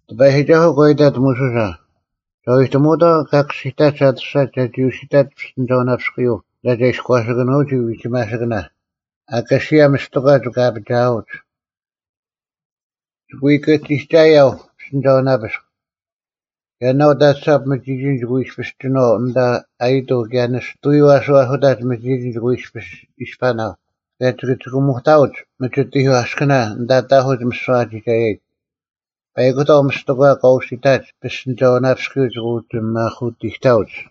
ᑎᐸᔨᒋᒐᓱᐤ ᒂ ᐃᑕᑦ ᒧᓱᓴ, “ᒐ ᐎᑎᒧᐅᑥᐤ ᑲ ᑭᔅᒋᑕᒡ ᐊᑐᔅᒐᒡ ᒐᒋ ᐅᓯᑕᒡ ᐱᔅᑎᓂᒐᐅᓇᐱᔅᑯᔪᐤ ᐊᓐᑕ ᒐ ᐃᔎᓴᑭᓄᐅᒋ ᐎᒋᒪᓯᑭᓇ, ᐊᑲᓯᐊ ᒥᔅᑎᒂ ᒋᑭ ᐊᐱᒋᐊᐅᒡ᙮ ᒋᑭ ᐎ ᑭᒋᒐᔭᐤ ᐱᔅᑎᓂᒐᐅᓇᐱᔅᒄ᙮ ᔭᓇᐅᑕᑐᓴᑉ ᒥᒋᒋᓐ ᒋᑭ ᐎ ᐃᔅᐱᔅ ᒋᓏᐤ ᐊᓐᑕ ᐊᔨᑐᐤ ᑭᔭ ᓂᔅᑐᔪᐤ ᐊᓱ ᐊᓱᑕᒡ ᒥᒋᒋᓐ ᒋᑭ ᐎ ᐃᔅᐱᔅ ᐃᔅᐸᓇᐤ ᑭᔭ ᒋᑭ ᒋᑭᒧᑕᐅᒡ ᒥᒋᑎᐧᒄ ᐊᔅᑭᓇ ᐊᓐᑕ ᑕᐧᑯᒡ ᒥᓯᐛ ᐊ ᒋᒐᔭᔨᒡ᙮ ᐸᐃᑯᑕᐤ ᒥᔅᑎᒂ ᑲ ᐅᓯᑕᒡ ᐱᔅᑎᓂᒐᐅᓇᐱᔪᐤ ᒋᑭ ᐅᒋ ᒧᐧᑯᑎᑕᐅᒡ᙮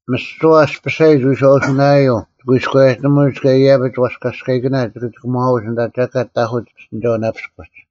ᒥᓯᐛ ᐊᔅᐱᓴᔨᒡ ᐎᔄᐅᓱᓇᔭᔪᐤ ᒋᑭ ᐎᔎᔭᒋᓂᒧᒡ ᑭᔭ ᐃᔭᐱᒡ ᐛᔅᑲᔅᑲᐃᑭᓇ ᒋᑭ ᒋᑭᒺᐅᒡ ᐊᓐᑕ ᒐᑲᑦ ᑕᐧᑯᒡ ᐱᔅᑎᓂᒐᐅᓇᐱᔅᑯᒡ᙮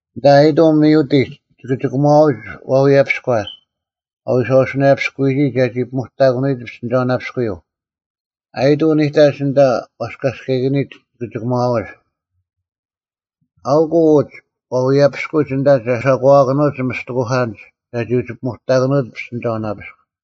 ᐊᓐᑕ ᐊᔨᑐᐤ ᒥᐅᑎᒡ ᒋᑭ ᒋᑭᒺᐅᒡ ᐛᐎᔭᐱᔎ ᐊ ᐎᔄᐅᓱᓇᔭᐱᔅᑯᔨᒋ ᒐᒋ ᐱᒧᑕᑭᓄᐎᔨᒡ ᐱᔅᑎᓂᒐᐅᓇᐱᔅᑯᔪᐤ᙮ ᐊᔨᑐᐤ ᓂᑕᒡ ᐊᓐᑕ ᐛᔅᑲᔅᑲᐃᑭᓂᒡ ᒋᑭ ᒋᑭᒺᐅᒡ᙮ ᐊᐅᑯᐤ ᐅᒡ ᐛᐎᔭᔅᐱᑯᒡ ᐊᓐᑕ ᒐ ᓴᒂᐛᑭᓄᐅᒡ ᒥᔅᑎᑯᐧᑲᓐᒡ ᒐ ᐅᒋ ᐱᒧᑕᑭᓄᐅᒡ ᐱᔅᑎᓂᒐᐅᓇᐱᔅᑯᒡ᙮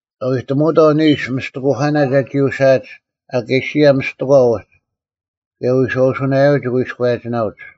ᒐ ᐎ ᑎᒧᐅᑥᐤ ᓂᓱ ᒥᔅᑎᑯᐧᑲᓇ ᒐᒋ ᐅᓯᐊᒡ ᐊᑲᓯᔭ ᒥᔅᑎᒂ ᐅᒡ ᑭᔭ ᐎᔄᐅᓱᓇᔭᐤ ᒋᑭ ᐎᔎᔭᒋᓇᐅᒡ᙮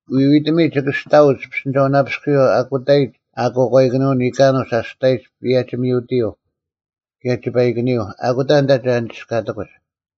ᐎᐎᑎᒥᒡ ᒋᑭ ᐊᔅᑕᐅᒡ ᐱᔅᑎᓂᒐᐅᓇᐱᔅᑯᔪᐤ ᐊᑯᑕᔨᒡ ᐊᑯᐛᑲᐃᑭᓂᔪᐤ ᓂᑲᓄᒡ ᐊᔅᑕᔨᒡ ᐸᔭᒋ-ᒥᐅᑎᔪᐤ ᑭᔭ ᒋᐸᐃᑭᓂᔪᐤ᙮ ᐊᑯᑕ ᐊᓐᑕ ᒐ ᓂᒋᔅᑲᑎᑯᒡ᙮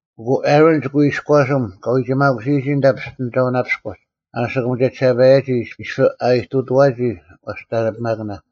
ᐊᑯ ᐊᕋᓐ ᒋᑭ ᐎ ᐃᔎᓯᒻ ᑲᐎᒋᒪᑯᓯᔨᒋ ᐊᓐᑕ ᐱᔅᑎᓂᒐᐅᓇᐱᔅᑯᒡ ᐊᓯᑯᒻ ᒋᔭᒋᓴᐸᔭᔨᒋ ᐃᔅᐱ ᐊ ᐃᑐᑐᐛᒋ ᐛᔅᑕᓂᐱᒪᑭᓇ᙮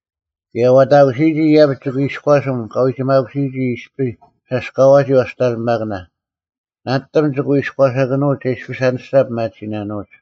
ᑭᔭ ᐛᑕᑯᓯᔨᒋ ᐃᔭᐱᒡ ᒋᑭ ᐃᔎᓯᐊᒻ ᑲᐎᒋᒪᑯᓯᔨᒋ ᐃᔅᐱ ᓴᔅᑲᐛᒋ ᐛᔅᑕᓂᐱᒪᑭᓇ᙮ ᓇᓂᑎᒻ ᒋᑭ ᐎ ᐃᔎᓴᑭᓄᐤ ᒐ ᐃᔅᐱᔅ ᐊᓂᔅᒐ ᐱᒪᑎᓯᓇᓄᐅᒡ᙮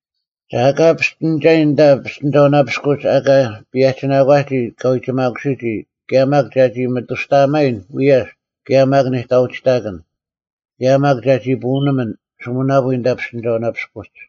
ᒐ ᐊᑲ ᐱᔅᑎᓂᒐᔨᓐ ᐊᓐᑕ ᐱᔅᑎᓂᒐᐅᓇᐱᔅᑯᒡ ᐊᑲ ᐸᔭᒋᓇᒂᔨᒋ ᑲᐎᒋᒪᑯᓯᔨᒋ ᑭᔭ ᒪᒃ ᒐᒋ ᒥᑐᔅᑕᐊᒪᔨᓐ ᐎᔭᔅ ᑭᔭ ᒪᒃ ᓂᑕᐅᒋᑕᑭᓐ, ᑭᔭ ᒪᒃ ᒐᒋ ᐳᐅᓂᒥᓐ ᓱᒥᓇᐳᔾ ᐊᓐᑕ ᐱᔅᑎᓂᒐᐅᓇᐱᔅᑯᒡ᙮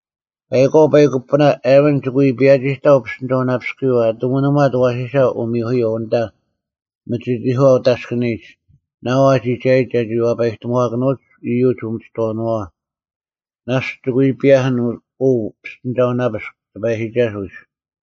ᐸᐃᒂᐤ ᐸᐃᒄ ᐱᐳᓇ, ᐊᕋᓐ ᒋᑭ ᐎ ᐸᔭᒋᑕᐤ ᐱᔅᑎᓂᒐᐅᓇᐱᔅᑯᔪᐤ ᐊ ᑐᒥᓂᒺᑦ ᐊᐛᓯᓴ ᐅᒥᔪᐧᑯᔪᐤ ᐊᓐᑕ ᒥᒋᑎᒂ ᐅᑦ ᐊᔅᑭᓂᔨᒡ ᓇᐤ ᐊ ᒋᒐᔭᔨᒡ ᒐᒋ ᐛᐸᔨᑎᒧᐛᑭᓄᐅᒡ ᐃᔪᒡ ᐅᒥᒋᑥᐅᓄᐛᐛ᙮ ᓇᔅᒡ ᒋᑭ ᐎ ᐸᔭᐧᑭᓐ ᐅ ᐱᔅᑎᓂᒐᐅᓇᐱᔅᒄ ᑎᐸᔨᒋᒐᓱᐤ ᐃᔅ᙮”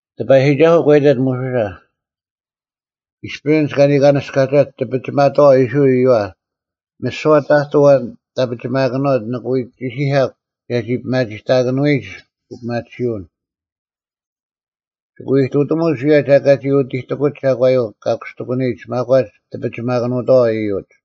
ᑎᐸᔨᒋᒐᓱᐤ ᒂ ᐃᑕᑦ ᒧᓱᓴ, “ᐃᔅᐱ ᐊᓐᒡ ᑲᓂᑲᓂᔅᑲᒐᒡ ᑎᐱᒋᒪᑥᐛ ᐃᔅᕋᐃᓪ ᐃᔪᐛ, ᒥᓯᐛ ᑕᑐᐤ ᐊᐛᓐ ᑕᐱᒋᒪᑭᓄᐅᑦ ᓂᑭ ᐎ ᒋᓯᐧᑲᒄ ᒐᒋ ᐱᒪᒋᑕᑭᓄᐎᔨᒡ ᐅᐱᒪᑎᓯᐅᓐ᙮ ᒋᑭ ᐎ ᐃᑐᑎᒧᒡ ᐅᔭ ᒐ ᐊᑲ ᒋ ᐅᑎᑎᑯᒡ ᒐᒂᔪᐤ ᑲ ᑯᔅᑕᑎᑯᓂᔨᒡ ᒪᒂᒡ ᑎᐱᒋᒪᑭᓄᑕᐛ ᐃᔪᒡ᙮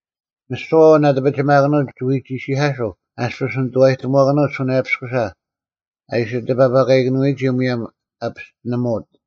ᒥᓯᐛ ᐊᐛᓐ ᐊ ᑎᐱᒋᒪᑭᓄᐅᑦ ᒋᑭ ᐎ ᒋᓯᐧᑲᓱᐤ ᐊᔅᐱᔅ ᓂᑐᐛᑎᒧᐛᑭᓄᐅᑦ ᓱᓇᔭᐱᔅᑯᓴ ᐊ ᐃᓯ ᑎᐸᐸᑲᐃᑭᓄᐎᔨᒋ ᒧᔭᒻ ᐊ ᐱᔅᑎᓂᒧᐅᑦ᙮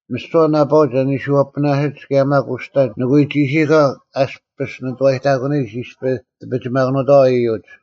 ᒥᓯᐛ ᓇᐸᐅᒡ ᐊ ᓂᓱᔪᐊᐳᓇᓯᒡ ᑭᔭ ᒪᒃ ᐅᔅᑕ ᓂᑭ ᐎ ᒋᓯᐧᑲᒄ ᐊᔅᐱᔅ ᓂᑐᐛᔨᑕᑯᓂᔨᒡ ᐃᔅᐱ ᑎᐱᒋᒪᑭᓄᑕᐛ ᐃᔪᒡ᙮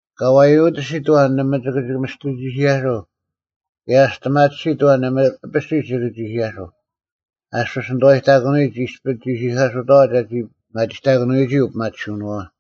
ᑲ ᐛᔪᑎᓯᑦ ᐊᐛᓐ ᓇᒪ ᒋᑭ ᒥᔅᑎ ᒋᓯᐧᑲᓱᐤ ᑭᔭ ᐊ ᒋᔅᑎᒪᑎᓯᑦ ᐊᐛᓐ ᓇᒪ ᐊᐱᓯᔅ ᒋᑭ ᒋᓯᐧᑲᓱᐤ ᐊᔅᐱᔅ ᓂᑐᐛᔨᑕᑯᓂᔨᒡ ᐃᔅᐱ ᒋᓯᐧᑲᓱᑥᐛ ᒐᒋ ᐱᒪᒋᑕᑭᓄᐎᔨᒋ ᐅᐱᒪᑎᓯᔪᓄᐛᐛ᙮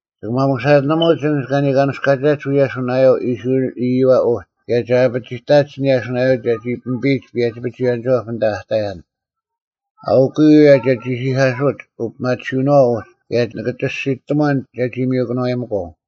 ᒋᑭ ᒪᒧᓴᒋᓂᒧᒡ ᐊᓐᒡ ᑲᓂᑲᓂᔅᑲᒐᒡ ᐅᔭ ᓱᓇᔭᐤ ᐃᔅᕋᐃᓪ ᐃᔪᐛ ᐅᒡ ᑭᔭ ᒐ ᐊᐱᑎᒡ ᐊᓐ ᓱᓇᔭᐤ ᒐᒋ ᐱᒥᐱᔨᒡ ᐸᔭᒋ-ᐱᒍᐎᔭᓂᒋᐛᑉ ᐊᓐᑕ ᐊᑕᔭᓐ᙮ ᐊᐅᑯᔪᐤ ᐅᔭ ᒐᓯᐧᑲᓱᒡ ᐅᐱᒪᑎᓯᐅᓄᐛᐛ ᐅᒡ ᑭᔭ ᓂᑭ ᒋᔅᒋᑎᒺᓐ ᒐᒋ ᒥᔪᑭᓄᐛᔨᒥᒂᐤ᙮”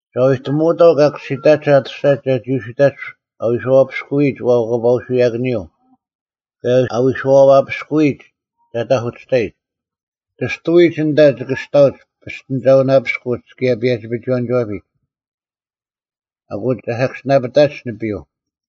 “ᒐ ᐎ ᑎᒧᐅᑥᐤ ᑲ ᑭᔅᒋᑕᒡ ᐊᑐᔅᒐᒡ ᒐᒋ ᐅᓯᑕᒡ ᐊ ᐎᔄᐛᐱᔅᑯᔨᒡ ᐛᐸᑲᐅᓱᔭᑭᓂᔪᐤ ᑭᔭ ᐊ ᐎᔄᐛᐱᔅᑯᔨᒡ ᒐ ᑐᐧᑯᑎᔅᑕᔨᒡ, ᑎᔅᑐᐎᒡ ᐊᓐᑕ ᒋᑭ ᐊᔅᑕᐅᒡ ᐱᔅᑎᓂᒐᐅᓇᐱᔅᑯᒡ ᑭᔭ ᐸᔭᒋ-ᐱᒍᐎᔭᓂᒋᐛᐱᒡ, ᐊᑯ ᒐ ᓴᑭᔅᒋᓇᐱᑕᒡ ᓂᐱᔪᐤ᙮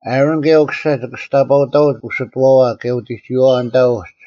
ᐊᕋᓐ ᑭᔭ ᐅᑯᓴ ᒋᑭ ᒋᔅᑕᐸᐅᑕᐅᒡ ᐅᓯᑐᐛᐛ ᑭᔭ ᐅᑎᒋᐛᐛ ᐊᓐᑕ ᐅᒡ᙮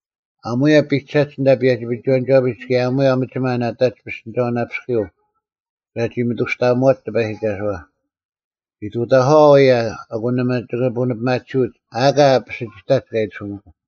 ᐊᒺᔭ ᐱᒐᒡ ᐊᓐᑕ ᐸᔭᒋ-ᐱᒍᐎᔭᓂᒋᐛᐱᒡ ᑭᔭ ᐊᒺᔭ ᒥᒋᒪ ᓇᑕᒡ ᐱᔅᑎᓂᒐᐅᓇᐱᔅᑯᔪᐤ ᒐᒋ ᒥᑐᔅᑕᐊᒧᐛᒡ ᑎᐸᔨᒋᒐᓱᐛ᙮ ᐃᑐᑕᒂᐛ ᐅᔭ, ᐊᑯ ᓇᒪ ᒋᑭ ᐳᓂᐱᒪᑎᓯᐅᒡ ᐊ ᐊᑲ ᐱᓯᒋᑕᒡ ᑲ ᐃᑎᓱᒥᒂᐤ᙮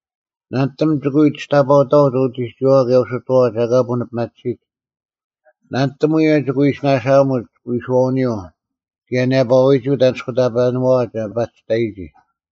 ᓇᓂᑎᒻ ᒋᑭ ᐎ ᒋᔅᑕᐸᐅᑕᐅᒡ ᐅᑎᒋᔨᐛᐛ ᑭᔭ ᐅᓯᑐᐛᐛ ᒐ ᐊᑲ ᐳᓂᐱᒪᑎᓯᒡ᙮ ᓇᓂᑎᒻ ᐅᔭ ᒋᑭ ᐎ ᓇᓴᐊᒧᒡ ᐎᓱᐛᐅᓂᔪᐤ ᑭᔭ ᓂᔭᐸᐎᒋ ᐅᑦ ᐊᓂᔅᑯᑕᐸᓄᐛᐛ ᒐ ᐸᒋ ᑕᔨᒋ᙮”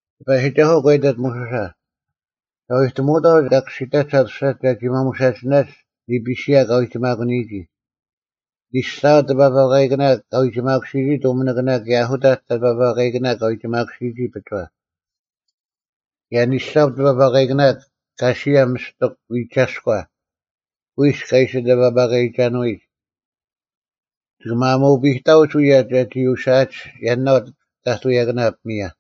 ᑎᐸᔨᒋᒐᓱᐤ ᒂ ᐃᑕᑦ ᒧᓱᓴ, “ᒐ ᐎᑎᒧᐅᑥᐤ ᑲ ᑭᔅᒋᑕᒡ ᐊᑐᔅᒐᒡ ᒐᒋ ᒪᒧᓴᒋᓇᒡ ᓂᐱᓯᔭ ᑲ ᐎᒋᒪᑯᓂᔨᒋ: ᓂᓴᑉ ᑎᐸᐸᑲᐃᑭᓇ ᑲ ᐎᒋᒪᑯᓯᔨᒋ ᑐᒥᓂᑭᓇ ᑭᔭ ᐊᓱᑕᒡ ᑎᐸᐸᑲᐃᑭᓇ ᑲ ᐎᒋᒪᓱᔨᒋ ᐱᒍᐛ᙮ ᑭᔭ ᓂᓴᑉ ᑎᐸᐸᐃᑭᓇ ᑲᓯᐊ ᒥᔅᑎᒃ ᐎᒐᔎ ᑯᐃᔅᒄ ᐊ ᐃᓯ ᑎᐸᐸᑲᐃᒐᓄᐎᒡ, ᒋᑭ ᒪᒧᐱᑕᐅᒡ ᐅᔭ ᒐᒋ ᐅᓯᐊᒡ ᔭᓇᐤ ᑕᑐᔭᑭᓇ ᐱᒥᔭ᙮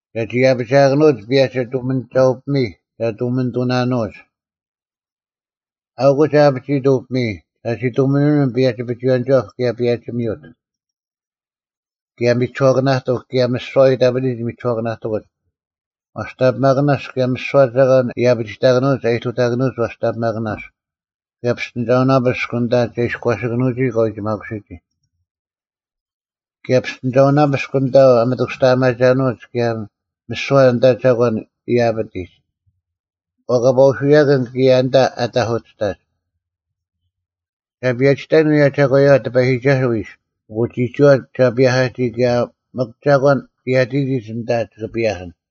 ᒐᒋ ᐊᐱᒋᐊᑭᓄᐅᑦ ᐸᔭᒋ ᑐᒥᓂᒐᐅ-ᐱᒥᔾ ᒐ ᑐᒥᓂᑐᓇᓄᐅᒡ᙮ ᐊᐅᑯᐤ ᒐ ᐊᐱᒋᐃᑦ ᐅ ᐱᒥᔾ ᒐᒋ ᑐᒥᓂᒥᓐ ᐸᔭᒋ-ᐱᒍᐎᔭᓂᒋᐛᑉ ᑭᔭ ᐸᔭᒋ-ᒥᐅᑦ, ᑭᔭ ᒥᒋᓱᐛᑭᓇᑎᒄ ᑭᔭ ᒥᓯᐛ ᐊ ᐃᑕᐱᑎᒡ ᒥᒋᓱᐛᑭᓇᑎᑯᒡ, ᐛᔅᑕᓂᐱᒪᑭᓇᔅᒄ ᑭᔭ ᒥᓯᐛ ᒐᒂᓐ ᐃᔭᐱᒋᑕᑭᓄᐅᒡ ᐊ ᐃᑐᑕᑭᓄᐅᒡ ᐛᔅᑕᓂᐱᒪᑭᓇᔅᒄ, ᑭᔭ ᐱᔅᑎᓂᒐᐅᓇᐱᔅᒄ ᐊᓐᑕ ᒐ ᐃᔎᓴᑭᓄᐅᒋ ᑲᐎᒋᒪᑯᓯᔨᒋ᙮ ᑭᔭ ᐱᔅᑎᓂᒐᐅᓇᐱᔅᒄ ᐊᓐᑕ ᐊ ᒥᑐᔅᑕᐊᒪᒐᓄᐅᒡ ᑭᔭ ᒥᓯᐛ ᐊᓐᑕ ᒐᒂᓐ ᐊ ᐃᑕᐱᑎᒡ, ᐛᐸᑲᐎᓱᔭᑭᓐ ᑭᔭ ᐊᓐᑕ ᑎᔭᐧᑯᑎᔅᑕᒡ᙮ ᒐ ᐸᔭᒋᑕᔨᓐ ᐅᔭ ᒐᒂᔪᐛ ᑎᐸᔨᒋᒐᓱᐤ ᐃᔅ, ᐊᑯ ᒋᒋᐛ ᒐ ᐸᔭᐧᑲᒋ ᑭᔭ ᒥᒄ ᒐᒂᓐ ᑕᔭᒋᑎᒡ ᐊᓐᑕ ᒋᑭ ᐸᔭᐧᑭᓐ᙮”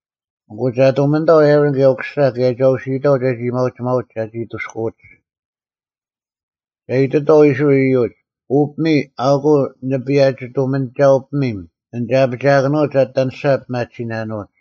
“ᐊᑯ ᒐ ᑐᒥᓂᑥᐤ ᐊᕋᓐ ᑭᔭ ᐅᑯᓴ ᑭᔭ ᒐ ᐅᓯᔨᑥᐤ ᒐᒋ ᐊᔭᒥᐊᐅᒋᒪᐅᒡ ᒐᒋ ᐊᑐᔅᑯᐅᒡ᙮ ᒐ ᐃᑎᑥᐤ ᐃᔅᕋᐃᓪ ᐃᔪᒡ, ‘ᐅ ᐱᒥᔾ ᐊᐅᑯᐤ ᓂᐸᔭᒋ-ᑐᒥᓂᒐᐅ-ᐱᒥᒻ ᐊᓐ ᒐ ᐊᐱᒐᑭᓄᐅᑦ ᒐ ᐊᑎ ᐊᓂᔅᒐ ᐱᒪᑎᓯᓇᓄᐅᒡ᙮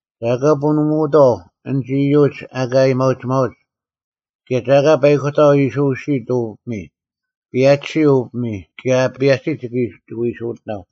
ᒐ ᐊᑲ ᐳᓂᒧᐅᑥᐤ ᐊᓐᒡ ᐃᔪᒡ ᐊᑲ ᐊᔭᒥᐊᐅᒋᒪᐅᒡ᙮ ᑭᔭ ᒐ ᐊᑲ ᐸᐃᑯᑕᐤ ᐃᓯ ᐅᓯᐊᑦ ᐅ ᐱᒥᔾ, ᐸᔭᒋᓯᐤ ᐅ ᐱᒥᔾ ᑭᔭ ᐊ ᐸᔭᒋᓯᑦ ᒋᑭ ᐎ ᐃᓯ ᐅᑎᓇᐤ᙮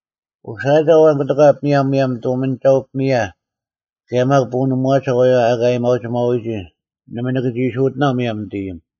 ᐅᓯᐊᒐ ᐊᐛᓐ ᑯᑎᒂ ᐱᒥᔭ ᒧᔭᒻ ᑐᒥᓂᒐᐅ-ᐱᒥᔭ ᑭᔭ ᒪᒃ ᐳᓂᒧᐛᒐ ᐊᐛᔪᐛ ᐊᑲ ᐊᔭᒥᐊᒋᒪᐅᐎᔨᒋ ᓇᒪ ᓂᑭ ᒋ ᐃᓯ ᐅᑎᓇᐤ ᒧᔭᒻ ᓂᑦ ᐃᔨᒻ᙮’”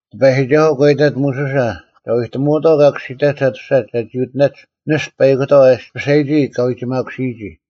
ᑎᐸᔨᒋᒐᓱᐤ ᒂ ᐃᑕᑦ ᒧᓱᓴ, “ᒐ ᐎᑎᒧᐅᑥᐤ ᑲ ᑭᔅᒋᑕᒡ ᐊᑐᔅᒐᒡ ᒐᒋ ᐅᑎᓇᒡ ᓂᔅᑐ ᐸᐃᑯᑕᐤ ᐊᔅᐱᓴᔨᒋ ᑲ ᐎᒋᒪᑯᓯᔨᒋ᙮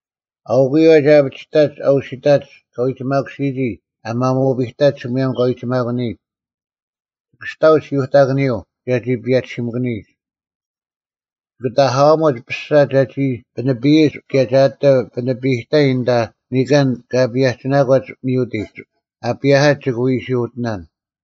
ᐊᐅᑯᐤ ᐅᔭ ᒐ ᐊᐱᒋᑕᒡ ᐊ ᐅᓯᑕᒡ ᑲᐎᒋᒪᑯᓯᔨᒋ ᐊ ᒪᒧᐱᑕᒡ ᒧᔭᒻ ᑲᐎᒋᒪᑯᓂᒡ, ᒋᑭ ᐊᔅᑕᐅᒡ ᓯᐅᑕᑭᓂᔪᐤ ᒐᒋ ᐸᔭᒋᓯᒥᑭᓂᔨᒡ᙮ ᒋᑭ ᑎᒂᐊᒧᒡ ᐱᔅᒐ ᒐᒋ ᐱᓂᐱᔨᒡ ᑭᔭ ᒐ ᐊᑎ ᐱᓂᐱᔨᑕᔨᓐ ᐊᓐᑕ ᓂᑲᓐ ᑲ ᐸᔭᒋᓇᒂᒡ ᒥᐅᑎᒡ ᐊ ᐸᔭᐧᑲᒡ ᒋᑭ ᐎ ᐃᓯ ᐅᑎᓇᓐ᙮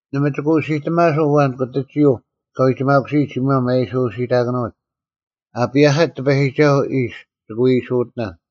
ᓇᒪ ᒋᑭ ᐅᓯᑎᒪᓱᐤ ᐊᐛᓐ ᑯᑎᒋᔪᐤ ᑲᐎᒋᒪᑯᓯᔨᒡ ᒧᔭᒻ ᐊ ᐃᓯ ᐅᓯᑕᑭᓄᐎᒡ, ᐊ ᐸᔭᐧᑲᒡ ᑎᐸᔨᒋᒐᓱᐤ ᐃᔅ ᒋᑭ ᐎ ᐃᓯ ᐅᑎᓇᓐ᙮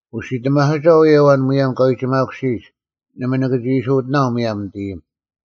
ᐅᓯᑎᒪᓱᒐ ᐅᔭ ᐊᐛᓐ ᒧᔭᒻ ᑲᐎᒋᒪᑯᓯᔨᒡ, ᓇᒪ ᓂᑭ ᒋ ᐃᓯ ᐅᑎᓇᐤ ᒧᔭᒻ ᓂᑦ ᐃᔨᒻ᙮”